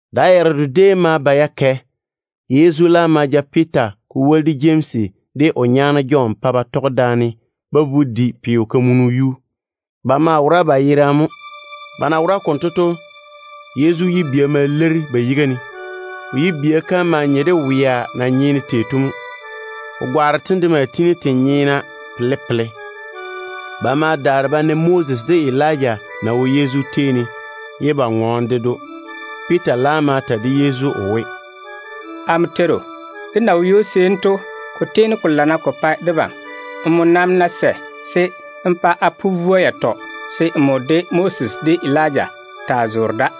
Da yaredo déem ma ba ya kɛ. Yezu laam ma ja Piita, ko woli de Jemsi, de o nyaane Jɔn pa ba tɔge daane ba vo ba di peo-kamunu yuu. Ba maa wora ba yerane mo. Ba na wora konto to, Yezu yibia ma leiri ba yiga ne. O yibia kam maa nye de wea na nyeene tei to mo. O gwaaro tem de maa tiini te peere ye te nyeena. Ba laam ma na Moses de Elija na wo Yezu tei ne, ye ba ŋɔɔne ded‑o. Piita laam ma ta de Yezu o we, “Amo Teiru, dé na wo ywo-seeni to, ko tiini ko lana ko pa debam. Nmo nam ná sɛ, se n pa a pu vwoa yatɔ ywo, se nmo de Moses de Elija taa zoore da.”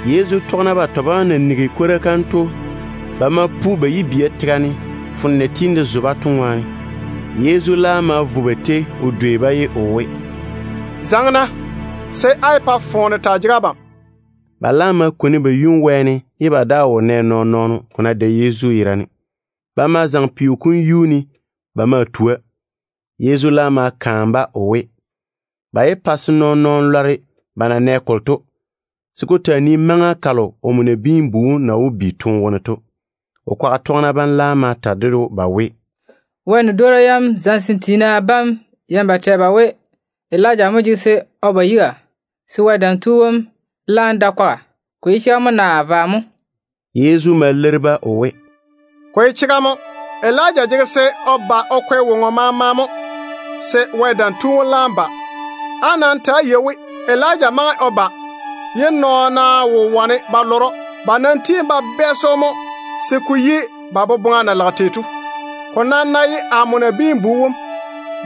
Yezu tɔgena batɔ bam na nigi kwora kam to, ba ma vwi ba yibia tega ne, foone na tiini de zo-ba to ŋwaane. Yezu laam ma vo ba tei o dwei-ba, ye o we, “Zaŋe-na, se á yé pa foone taa jege abam.” Ba laam ma kwoni ba yum wɛɛne, ye ba daa wo nɛ nɔɔn-nɔɔno, ko ná dae Yezu yerane. Ba ma zaŋe peo kom yuu ne ba maa tua. Yezu laam ma kaane-ba o we, ba yé pa se nɔɔn-nɔɔno lɔre ba na nɛ kolo to, se ko taa nii maŋa kalo omo Nabiin-bu wom na wó bi toone wone to. O kwaga tɔgena bam laam ma ta ded‑o ba we, “Wɛ nia yam zamesem tiina bam yeini ba tɛ ba we, Elija mo jege se o lwoori o ba yiga, se Wɛ Dam Tu wom laam da kwaga. Ko ye chega mo naa vwa mo?” Yezu ma leiri-ba o we, “Ko ye chega mo. Elija jege se o ba o kwɛ woŋo maama se Wɛ Dam Tu wom laam ba. Nam ta‑á yei-na we, Elija maŋe o ba ye nɔɔna wo wane ba lɔre‑o. Ba ma tiini ba bɛɛse‑o se ko yi ba boboŋa na lage tei to. Ko nam ná ye amo Nabiin-bu wom,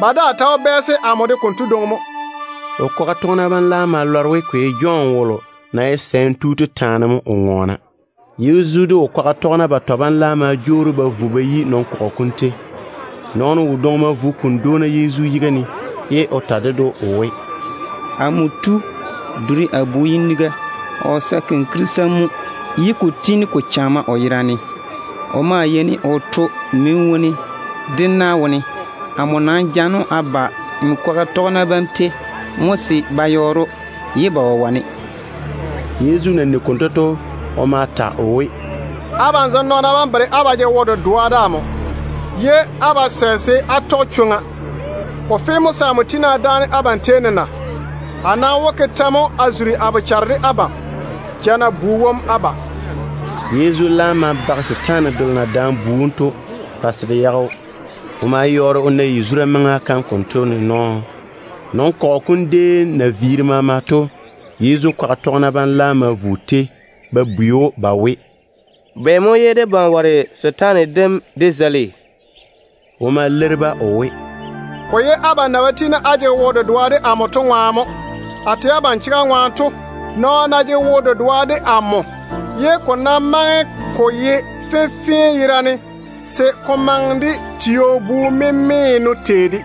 ba daa ta wó bɛɛse amo de konto dwoŋi mo.” O kwaga tɔgena bam laam ma lɔre we ko ye Jɔn wolo na ye sɛɛm tu to taane mo o ŋɔɔna. Yezu de o kwaga tɔgena batɔ bam laam ma jwoori ba vo ba yi nɔn-kɔgɔ kom tei. Nɔɔno wodwoŋi ma vo o kuni dwoona Yezu yiga ne o ta ded‑o o we, “Amo tu, duri amo bu yiniga. O sae kɔɔro mo ye ko tiini ko chana o yera ne. O maa yeini o toe mini wone de na wone. Amo nam jaane‑o a ba nmo kwaga tɔgena bam tei mo se ba yɔɔre‑o, ye ba wo wane.” Yezu na nigi konto to, o ma ta o we, “Abam zem nɔɔna bam bere á ba jege wo-dedoa de amo, ye á ba sɛ se á taa tɔge chwoŋa. Ko fe se a tiini a dáane abam tei ne se a vo a maŋe yei ne mo? A nam wó ke tɛ mo a zuri a bochare de abam? Ja-na bu wom á ba.” Yezu laam ma bage setaane delo na daane bu wom to pa se de yage‑o. O ma yɔɔre o na yazura maŋa kam konto ne nɔɔ. Nɔn-kɔgɔ kom déem na viiri maama to, Yezu kwaga tɔgena bam laam ma vo o tei ba bwei‑o ba we, “Bɛ mo ye debam ware setaane dem dé zeili?” O ma leiri-ba o we, “Ko ye abam boboŋa na muri to ŋwaane mo. A tɛ abam chega ŋwaane to, nɔɔno ná jege wo-dedoa de Wɛ, ye ko ná maŋe ko ye fenfee yerane se ko maŋe de tio-bu-memeeno tei de,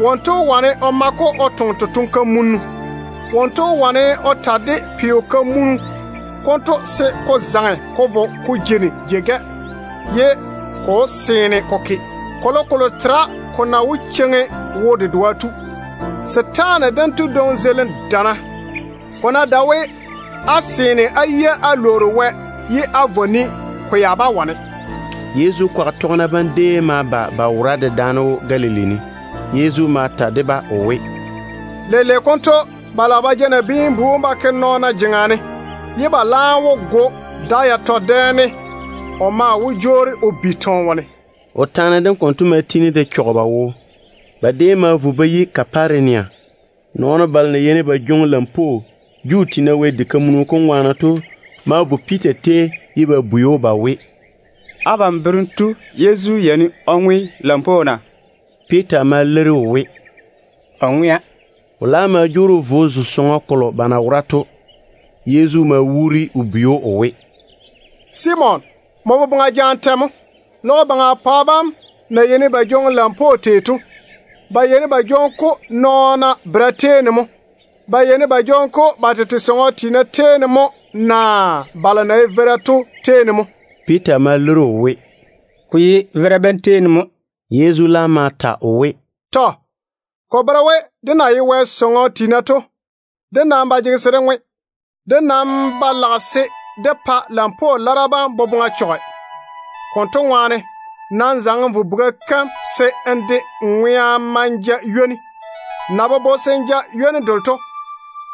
wonto wó wane o ma-ko o toŋe totoŋ-kamunnu. Wonto wó wane o ta de peo-kamunu konto se ko zaŋe ko vo ko jeini jei-gɛ, ye ko wó seene ko ke. Kolokolo tera ko na wó cheiŋi wo-dedoa tu. [ Setaane dento dwoŋi zeilim dana. Ko ná dae we á seene á yia á lwoori Wɛ ye á vɔ ni, ko ya bá wane.]” Yezu kwaga tɔgena bam déem ma ba ba jeeri daane Galili ne. Yezu ma ta de-ba o we, “Leile konto ba lage ba ja Nabiin-bu wom ba ke nɔɔna jeŋa ne, ye ba laam wó go‑o. Da yatɔ dɛ ne o nam wó jwoori o bi toone wone.” O taane dem konto ma tiini de chɔge ba wo. Ba déem ma vo ba yi Kaparenia. Juu tiina balo na yeini ba jwoŋi lampwoo Wɛ diga kam ŋwaane to ma vo Piita tei ye ba bwei‑o ba we, “Abam berem tu Yezu yeini o ŋwe lampwoo na?” Piita ma leiri o we, “O ŋwea.” O laam ma jwoori o vo o zo sɔŋɔ kolo ba na wora to. Yezu ma wuuri o bwei‑o o we, “Simon, nmo boboŋa jaane tɛ mo? Logo baŋa pwa bam na yeini ba jwoŋi lampwoo tei to, ba yeini ba jwoŋi-ko nɔɔna bera tei ne mo? Ba yeini ba jwoŋi-ko ba tete sɔŋɔ tiina tei ne mo naa balo na ye veira to tei ne mo?” Piita ma leiri‑o o we, “Ko ye veira bam tei ne mo.” Yezu laam ma ta o we, “Tɔ. Ko bere we, dé na ye Wɛ sɔŋɔ tiina to, dé nam ba jege se dé ŋwe. Dé nam ba lage se dé pa lampwoo lara bam boboŋa chɔge. Konto ŋwaane nam zaŋe n vo buga kam ni se n de gwola n ma n ja ywoni. Nmo na bobo se n ja ywoni delo to,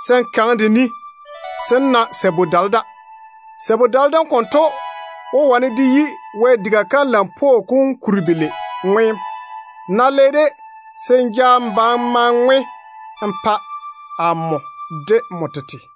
se n kaŋe de ni se n na sabu-dale da. Sabu-dale dem konto wó yi Wɛ diga kam lampwoo kom kuni belei ŋweem. N ná le-de, se n ja n ba n ma n ŋwe n pa amo de n tete.”